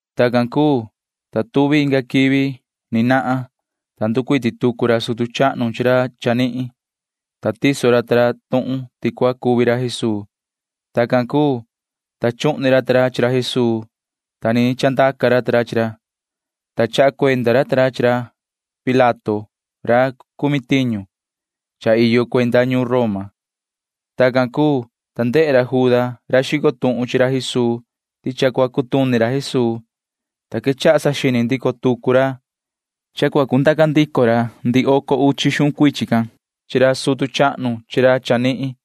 Tacan cuu, ta tuvi inga quivi. Ni vii nahan, ta nducuiti tucu ra sutu chahnu chi ra chanihin, ta tiso ra ta ra tuhun ti cua cuvi ra Jesuu. Tacan cuu, ta chuhni ra ta ra chi ra Jesuu, ta ni chandaca ra ta ra chi ra, ta chaha cuenda ra ta ra chi ra Pilato ra cumi tiñu [cha iyo cuenda ñuun Roma]. Tacan cuu, ta ndehe ra Juda ra xico tuhun chi ra Jesuu ti cha cua cutuni ra Jesuu, ta quechaha saxini ndico tucu ra, ta cundaca ndico ra ndihi oco uchi xuhun cuichin can chi ra sutu chahnu chi ra chanihin,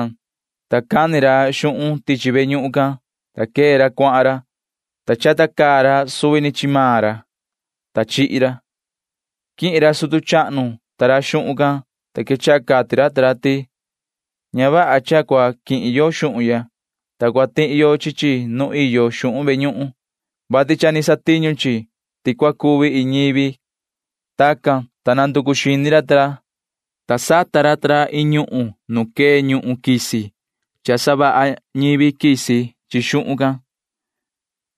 Tacan, ta cani ra xuhun tichi ve ñuhun can, ta quee ra cuahan ra, ta chata caa ra suvi ni chi maan ra, [ta chihi ra]. Quihin ra sutu chahnu ta ra xuhun can, ta quechaha cati ra ta ra ti: ―Ña vaha cha cua quihin yo xuhun ya, ta cua tihi yo chi chi nu iyo xuhun ve ñuhun, vati cha ni satiñu chi, ti cua cuvi iin ñivi ―cati ra. Tacan, ta nanducu xini ra ta ra, ta chi xuhun can sata ra ta ra iin ñuhun nu quee ndahyu savaha ñivi quisi.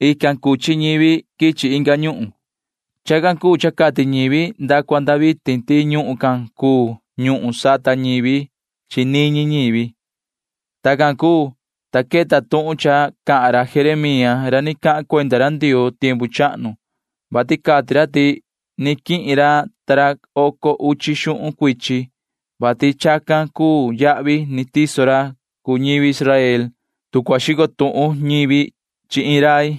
Ican cuchi toho quichi inga ñuhun. Chacan cuu cha cati ñivi nda cua nda vitin ti ñuhun can cuu ñuhun sata ñivi chi niñi ñivi. Tacan cuu, ta queta tuhun cha cahan ra Jeremía ra ni cahan cuenda ra Ndioo tiempu chahnu, vati cati ra ti ni quihin ra ta ra oco uchi xuhun cuichin, vati chacan cuu yahvi ni tiso ra cuu ñivi Israel, tu cua xico tuhun ñivi chi iin rai,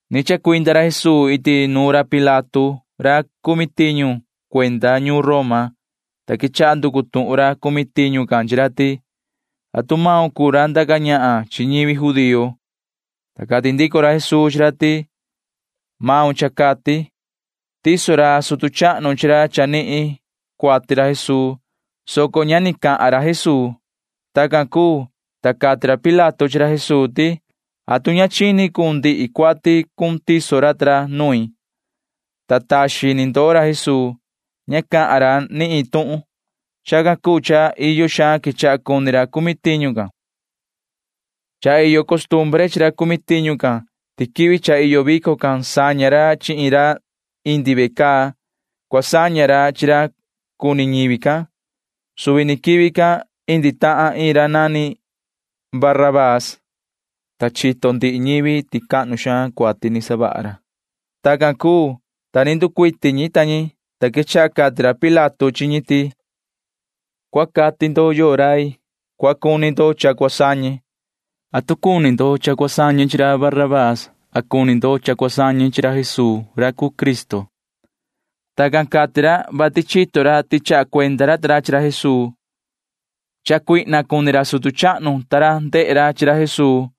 Ni chacuinda ra Jesuu iti nuun ra Pilato ra cuu cumi tiñu cuenda ñuun Roma, ta quechaha nducu tuhun ra cumi tiñu can chi ra ti: ―¿Atu maun cuu ra ndaca ñahan chi ñivi judío? ―cati ra Pilato can. Ta cati ndico ra Jesuu chi ra ti: ―Cha cati maun ―cati ra. Tiso ra sutu chahnu chi ra chanihin cuati ra Jesuu, soco ñahni cha cati ndico ra Jesuu. Tacan cuu, ta cati ra Pilato chi ra Jesuu ti: ―¿Atu ña chini cun ndihi cuati cun tiso ra ta ra nuin? ―cati ra chi ra. Ta taxin ni ndoo ra Jesuu. Ña cahan ra ni iin tuhun. Chacan cuu cha iyo xaan quechaha cuni ra cumi tiñu can. Cha iyo costumbre chi ra cumi tiñu can ti quivi cha iyo vico can saña ra chi iin ra indi ve caa. Cua saña ra chi ra cuni ñivi can. Suvi ni quivi can indi tahan iin ra nani Barabaa, ta chito ndihi ñivi ti cahnu xaan cuati ni savaha ra. Tacan cuu, ta ni nducuiti ñi ta ñi, ta quechaha cati ra Pilato chi ñi ti: ―Cua cati ndo yoo rai cua cuni ndo cha cua sañe. ¿Atu cuni ndo cha cua sañe chi ra Barabaa a cuni ndo cha cua sañe chi ra Jesuu ra cuu Cristo? Tacan cati ra, vati chito ra ti chaha cuenda ra ta ra chi ra Jesuu, vati ndusoo cuni ra sutu chahnu ta ra ndehe ra chi ra Jesuu.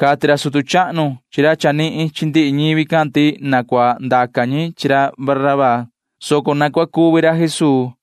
Cati ra sutu chahnu chi ra chanihin chihin ndihi ñivi can ti na cua ndaca ñi chi ra Barabaa, soco na cua cuvi ra Jesuu,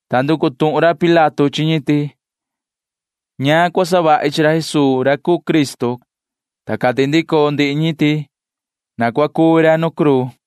Ta nducu tuhun ra Pilato chi ñi ti: ―¿Ñaan cua savahi chi ra Jesuu ra cuu Cristo? ―cati ra. Ta cati ndico ndihi ñi ti: ―Na cua cuvi ra nu cruu ―cati ñi.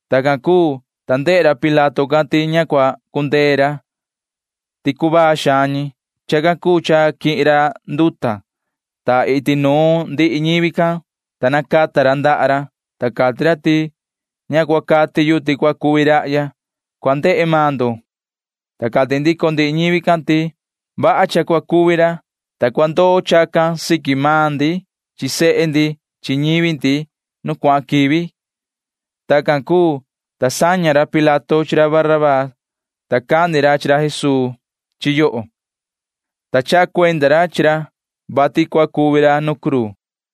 Tacan cuu, ta ndehe ra Pilato can ti ña cua cundee ra, soco cuvaa ca ñi. Chacan cuu cha quihin ra nduta, ta iti nuun ndihi ñivi can nacata ra ndaha ra, ta cati ra ti: ―Ña cua cati yu ti cua cuvi rahya. Cua ndehe maan ndo ―cati ra. Ta cati ndico ndihi ñivi can ti: ―Vaha cha cua cuvi ra, ta cua ndoo chacan siqui maan ndi chi sehe ndi chi ñivi ndi nu cuahan quivi ―cati ñi. Tacan cuu, ta saña ra Pilato chi ra Barabaa, soco cani ra chi ra Jesuu chi yoho, ta chaha cuenda ra chi ra, vati cua cuvi ra nu cruu.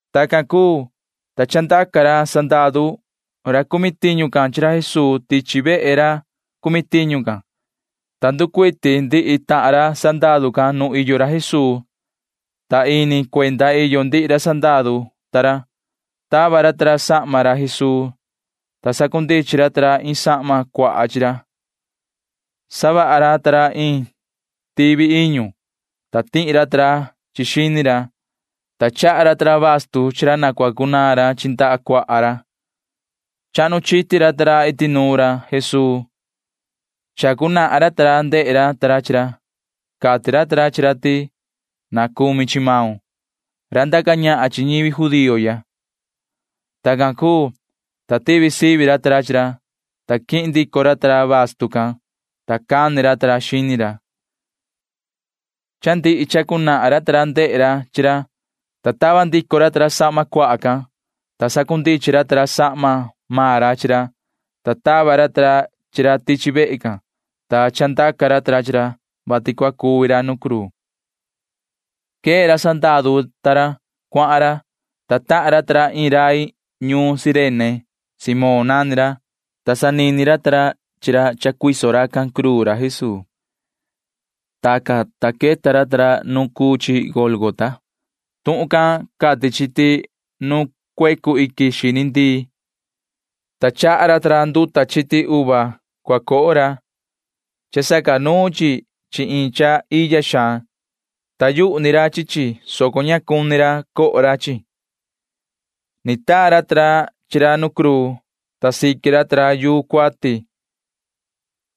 Tacan cuu, ta chandaca ra sandaru ra cumi tiñu can chi ra Jesuu tichi vehe ra cumi tiñu can, ta nducuiti ndihi ra tahan ra sandaru can nu iyo ra Jesuu, ta ini cuenda iyo ndihi ra sandaru ta ra. Tava ra ta ra sahma ra Jesuu, ta sacundichin ra ta ra iin sahma cuaha. Savaha ra ta ra iin tivi iñu, ta tihi ra ta ra chi chi xini ra, ta chaha ra ta ra bastu chi ra na cua cunaan ra chi ndaha cuaha ra. Chahnu chiti ra ta ra iti nuun ra Jesuu, ta sacateni ra ta ra chi ra. Cati ra ta ra chi ra ti: ―Na cumi chi maun, yoho ra ndaca ñahan chi ñivi judío ya ―cati ra sandaru ta ra. Tacan cuu, ta tivi sivi ra ta ra chi ra, ta quihin ndico ra ta ra bastu can, ta cani ra ta ra xini ra. Cha ndihi sacateni ra ta ra chi ra, ta tava ndico ra ta ra sahma cuaha can, ta sacundichin ndico ra ta ra sahma maan ra chi ra, ta tava ra ta ra chi ra tichi vehe can, ta chandaca ra ta ra chi ra, vati cua cuvi ra nu cruu. Quee ra sandaru ta ra. Cuahan ra, ta tahan ra ta ra iin rai ñuun Cirene. Simón nani ra, ta sanini ra ta ra, vati cua cuiso racan cruu ra Jesuu. Tacan, ta queta ra ta ra nuun cuu chi Gólgota. Tuhun can cati chi ti nu cuecu iquin xini ndii cuu chi, ta chaha ra ta ra nduta chiti uva cua coho ra. Cha sacanuun chi chi iin cha iya xaan. Taa yuhu ni ra chi chi, soco ña cuni ra coho ra chi chi. Ni taa ra ta ra chi ra nu cruu, ta siqui ra ta ra chi yuu cuati,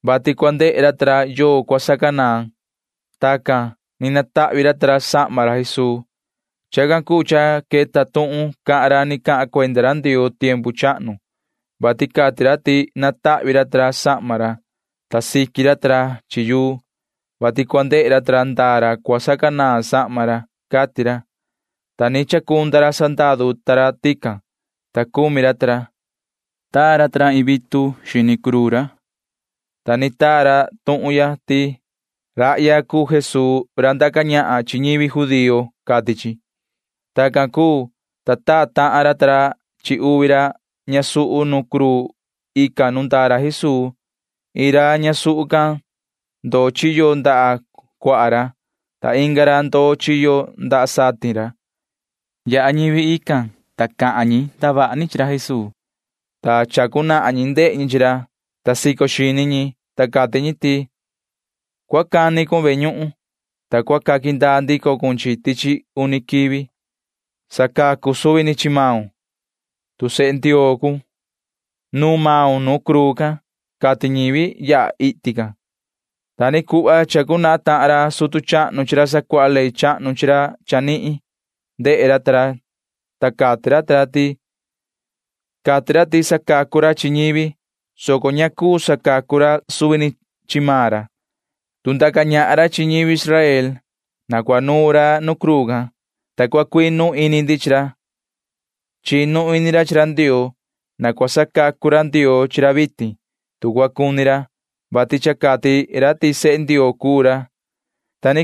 vati cua ndehe ra ta ra yoo cua sacanaan. Tacan ni natahvi ra ta ra sahma ra Jesuu. Chacan cuu cha queta tuhun cahan ra ni cahan cuenda ra Ndioo tiempu chahnu, vati cati ra ti natahvi ra ta ra sahma ra, ta siqui ra ta ra chi yuu, vati cua ndehe ra ta ra ndaa ra cua sacanaan sahma ra, cati ra, ta ni chacunda ra sandaru ta ra tican, ta cumi ra ta ra. Taa ra ta ra iin vitu siqui xini ra, ta ni taa ra tuhun ya ti: “Rahya cuu Jesuu ra ndaca ñahan chi ñivi judío,” cati chi. Tacan cuu, ta taa tahan ra ta ra chi uvi ra ñasuhu nu cruu ican nu ndaa ra Jesuu. Iin ra ñasuhu can ndoo chiyo ndaha cuaha ra, ta inga ra ndoo chiyo ndaha satin ra. Yaha ñivi tican, ta cahan ñi ndavaha ni chi ra Jesuu. [Sacateni ñi chi ra,] ta sico xini ñi, ta cati ñi ti: ―Yoho cua cani cun ve ñuhun, ta cua sandaa ndico cun chi chi tichi uni quivi. Na sacacu cun suvi ni chi maun, tu sehe Ndioo cuun. Na nuun maun nu cruu can ―cati ñivi yaha iti can. Ta ni cuhva sacateni tahan ra sutu chahnu chi ra sacuaha ley chahnu chi ra chanihin, ta cati ra ta ra ti: ―Cati ra ti sacacu ra chi ñivi, soco ña cuu sacacu ra suvi ni chi maan ra. Tu ndaca ñahan ra chi ñivi Israel, na cua nuun ra nu cruu can, ta cua cuinu ini ndi chi ra. Chinu ini ra chi ra Ndioo. Na cua sacacu ra Ndioo chi ra vitin, tu cua cuni ra, vati cha cati ra ti sehe Ndioo cuu ra ―cati racan ta ra.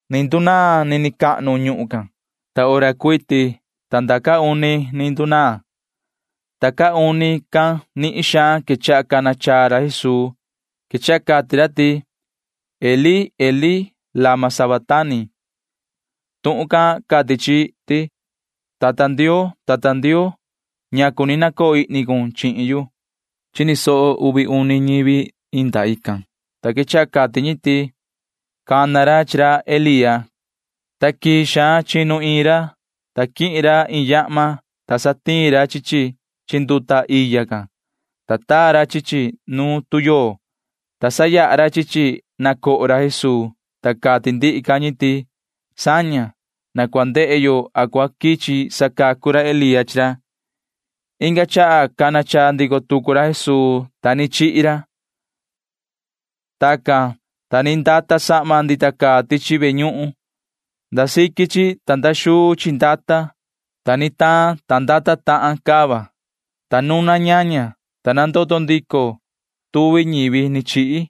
Ni ndunaan nini cahnu ñuhun can. Ta hora cuiti ta nda caa uni ni ndunaan, ta caa uni can nihin xaan quechaha cana chaa ra Jesuu. Quechaha cati ra ti: ―Elí, Elí, ¿lama sabactani? ―cati ra. Tuhun can cati chi ti: “Yoho tata Ndioo, yoho tata Ndioo, ¿ñacu ni nacoo ihni cun chihin yu?” Chini soho uvi uni ñivi inda ican, ta quechaha cati ñi ti: ―Cana ra chi ra Elía ―cati ñi. Ta quii xaan chinu iin ra, ta quihin ra iin yahma, ta satiin ra chi chi chi nduta iya can, ta taa ra chi chi nu tuyoo, ta sayaha ra chi chi na coho ra Jesuu, ta cati ndihi ca ñi ti: ―Saña. Na cua ndehe yo a cua quichi sacacu ra Elía chi ra ―cati ñi. Inga chaha cana chaa ndico tucu ra Jesuu, ta ni chihi ra. Tacan, ta ni ndata sahma ndita caa tichi ve ñuhun cahnu can. Nda siqui chi ta nda xuu chi ndata maan chi, ta ni taan, ta ndata tahan cava, ta nuna ñaña, ta nandoto ndico tuvi ñivi ni chihi.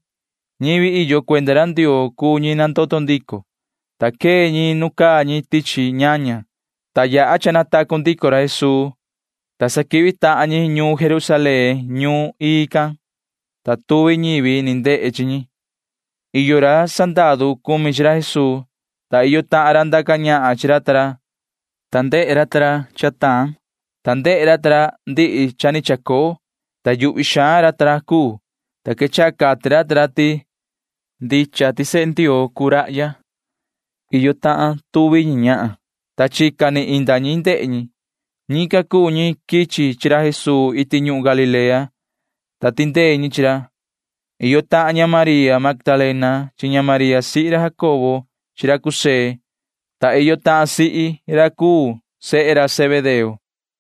Ñivi iyo cuenda ra Ndioo cuu ñi nandoto ndico, ta quee ñi nu caa ñi tichi ñaña, ta yaha cha natacu ndico ra Jesuu, ta sa quihvi tahan ñi ñuun Jerusalén ñuun ii can, ta tuvi ñivi ni ndehe chi ñi. Iyo ra sandaru cumi chi ra Jesuu, ta iyo tahan ra ndaca ñahan chi ra ta ra, ta ndehe ra ta ra nu taan, ta ndehe ra ta ra ndihi cha ni chacoo, ta yuhvi xaan ra ta ra cuu, ta quechaha cati ra ta ra ti: ―Ndicha ti sehe Ndioo cuu rahya ―cati ra ta ra. Ican iyo tahan tuvi ñi ñahan, ta chica vihi inda ñi ndehe ñi. Ñican cuu ñi quichi chi ra Jesuu iti ñuhun Galilea, ta tindee ñi chi ra. Iyo tahan ña María Magdalena chi ña María sihi ra Jacobo chi ra José, ta iyo tahan sihi ra cuu sehe ra Zebedeo.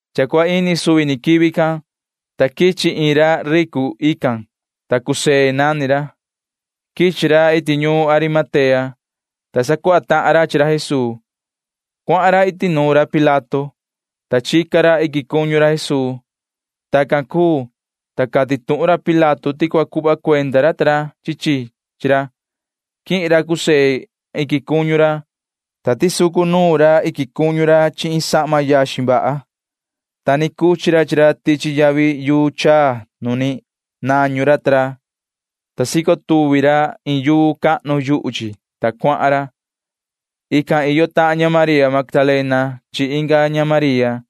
Cha cua ini suvi ni quivi can, ta quichi iin ra ricu ican, ta José nani ra. Quichi ra iti ñuun Arimatea, ta sacuaha tahan ra chi ra Jesuu. Cuahan ra iti nuun ra Pilato, ta chica ra iquin cuñu ra Jesuu. Tacan cuu, ta cati tuhun ra Pilato ti cua cuhva cuenda ra ta ra chi chi chi ra. Quihin ra José can iquin cuñu ra, ta tisucu nuun ra iquin cuñu ra chi iin sahma yaxin vaha, ta ni cuchi ra chi ra tichi yavi yuu chaa nu ni nañu ra ta ra, ta sico tuvi ra iin yuu cahnu yuhu chi, ta cuahan ra. Ican iyo tahan ña María Magdalena can chi inga ña María.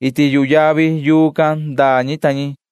Iti yuhu yavi yuu can ndaa ñi ta ñi.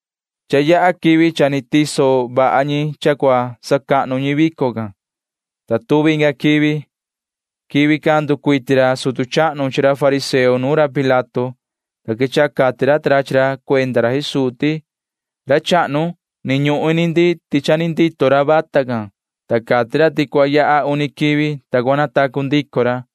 Cha yaha quivi cha ni tiso vaha ñi cha cua sacahnu ñi vico can, ta tuvi inga quivi. Quivi can nducuiti ra sutu chahnu chi ra fariseo nuun ra Pilato, ta quechaha cati ra ta ra chi ra cuenda ra Jesuu ti: ―Ra chahnu, ni ñuhun ini ndi ti ni vii ndito ra vata can, ta cati ra ti cua yaha uni quivi, ta cua natacu ndico ra.